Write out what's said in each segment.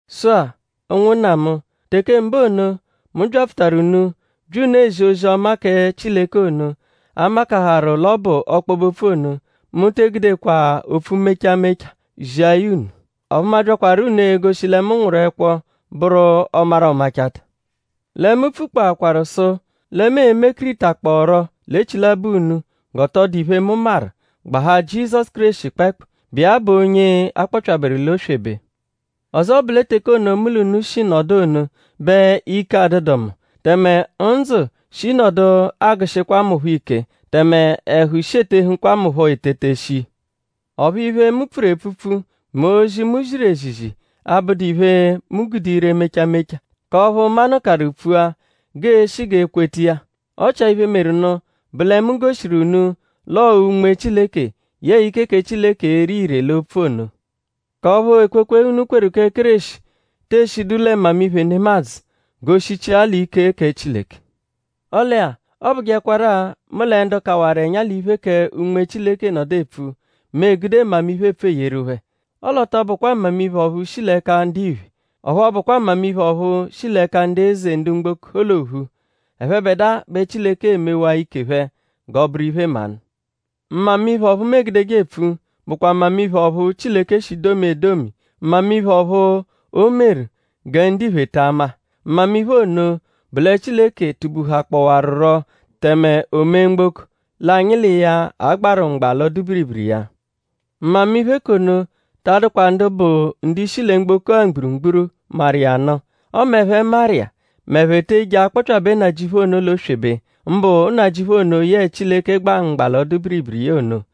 Sụ-a; ụnwunna mu; teke mbụ ono, mu byapfutaru unu bya unu ezi ozi-ọma kẹ Chileke ono, a makaharụ l'ọ bụ ọkpobe-opfu ono; mu te egudekwa opfu mecha mecha zia ya unu; ọphu mu abyakwaru unu egoshi lẹ mu nwụru ẹkwo bụru ọ-maru-ọ-machata. Lẹ mu pfukpọakwaru sụ lẹ mu e-mekiritakpọoro l'echilabọ unu g'ọ tọ dụdu iphe, mu maru; gbahaa Jizọsu Kéreshi kpẹekpu, bụ iya bụ onye a kpọpyaberu l'oswebe. Ọzo bụ lẹ teke ono, mu l'unu shi nọdu ono bẹ ike adụdu mu; tẹme ndzụ shi nọdu agụ-shikwa mu phọ ike; tẹme ẹhu shi etehụkwa mu phọ etete shii. Ọphu iphe, mu pfuru epfupfu mẹ ozi, mu ziru ezizi, abụdu iphe, mu gude ire mecha mecha k'ọphu manụkarunu pfua g'eeshi g'ee-kweta iya. Ọ chia iphe, meru nụ bụ lẹ mu goshiru unu l'ọo Unme Chileke yẹe ike kẹ Chileke ere ire l'opfu ono; k'ọphu ekwekwe, unu kweru kẹ Kéreshi tee shidu lẹ mmamiphe nemadzụ; g'o shichia l'ike kẹ Chileke. Ọle-a; ọ bụjekwaru-a; mu lẹ ndu kawaru ẹnya l'iphe kẹ Unme Chileke nọdu epfu; mu egude mmamiphe epfu eyeru phẹ. Ọle ọ tọ bụkwa mmamiphe ọphu shi l'ẹka ndiphe; ọphu ọ bụkwa mmamiphe ọphu shi l'ẹka ndu eze ndu mgboko l'ophu; ẹphebedua bẹ Chileke emewaa ike phẹ g'ọ bụru iphe-mmanụ. Mmamiphe ọphu mu egudeje epfu bụkwa mmamiphe ọphu Chileke shi domia edomi; mmamiphe ọphu o meru gẹ ndiphe ta ama. Mmamiphe ono bụ lẹ Chileke tubuhakpọwaruro tẹme o mee mgboko; l'anyi l'iya a-gbarụ mgba l'ọdu-biribiri iya. Mmamiphe k'ono ta adụkwa ndu bụ ndu-ishi lẹ mgboko-a mgburugburu maru iya nụ. Ọme ẹphe maru iya; m'ẹphe te eje akpọpyabe Nnajịuphu ono l'oswebe; mbụ Nnajịuphu ono, yẹe Chileke gba mgba l'ọdu-biribiri iya ono.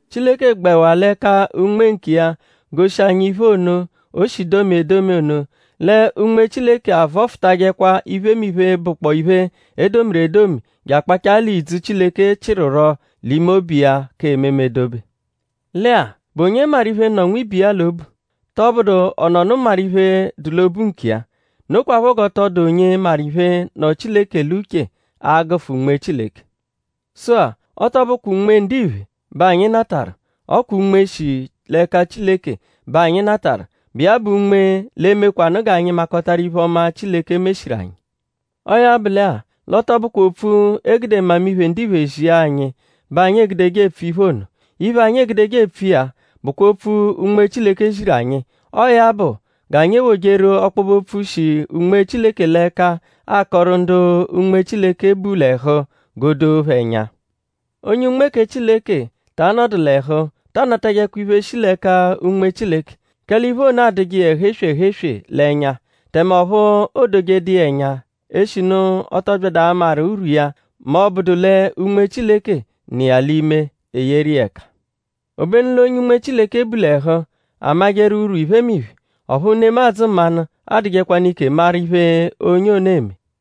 Chileke gbẹwa l'ẹka Unme nkiya goshi anyi iphe ono, o shi domia edomi ono. Lẹ Unme Chileke avọfutajekwa iphemiphe, bụkpoo iphe, e domiru edomi je akpachaa l'ìdzù, Chileke chịruro l'ime obu iya k'ememe dobe. Lẹ-a;?bụ onye maru iphe nọ nwibe iya l'obu??Tọbudu ọ nọnu maru iphe, dụ l'obu nkiya. Nokwaphọ g'ọ tọ dụdu onye maru iphe, nọ Chileke l'uche a -gụfu Unme Chileke. Sụ-a; ọ tọ bụkwa unme ndiphe bẹ anyi natarụ; ọ kwa Unme, shi l'ẹka Chileke bẹ anyi natarụ, bụ iya bụ Unme, l'e-mekwanụ g'anyi makọtaru iphe-ọma, Chileke meshiru anyi. Ọo ya bụ lẹ-a; l'ọ tọ bụkwa opfu, e gude mmamiphe ndiphe zia anyi bẹ anyi egudeje epfu iphe ono. Iphe, anyi egudeje epfu iya bụkwa opfu, Unme Chileke ziru anyi. Ọo ya bụ g'anyi ewojeru ọkpobe-opfu, shi Unme Chileke l'ẹka akọru ndu Unme Chileke bu l'ẹhu g'o doo phẹ ẹnya. Onye Unme kẹ Chileke ta anọdu l'ẹhu ta anatajẹkwa iphe, shi l'ẹka Unme Chileke; kẹle iphe ono adụje iya ẹhu-eswe ẹhu-eswe l'ẹnya. Tẹme ọphu o dojedu iya ẹnya eshinu ọ tọ byadu amaru urwu iya mẹ ọ bụdu lẹ Unme Chileke, nọ l'ime iya eyeru iya ẹka. Obenu l'onye Unme Chileke bu l'ẹhu; amajẹru urwu iphemiphe; ọphu nemadzụ mmanụ adụjekwanu ike maru iphe onye ono eme.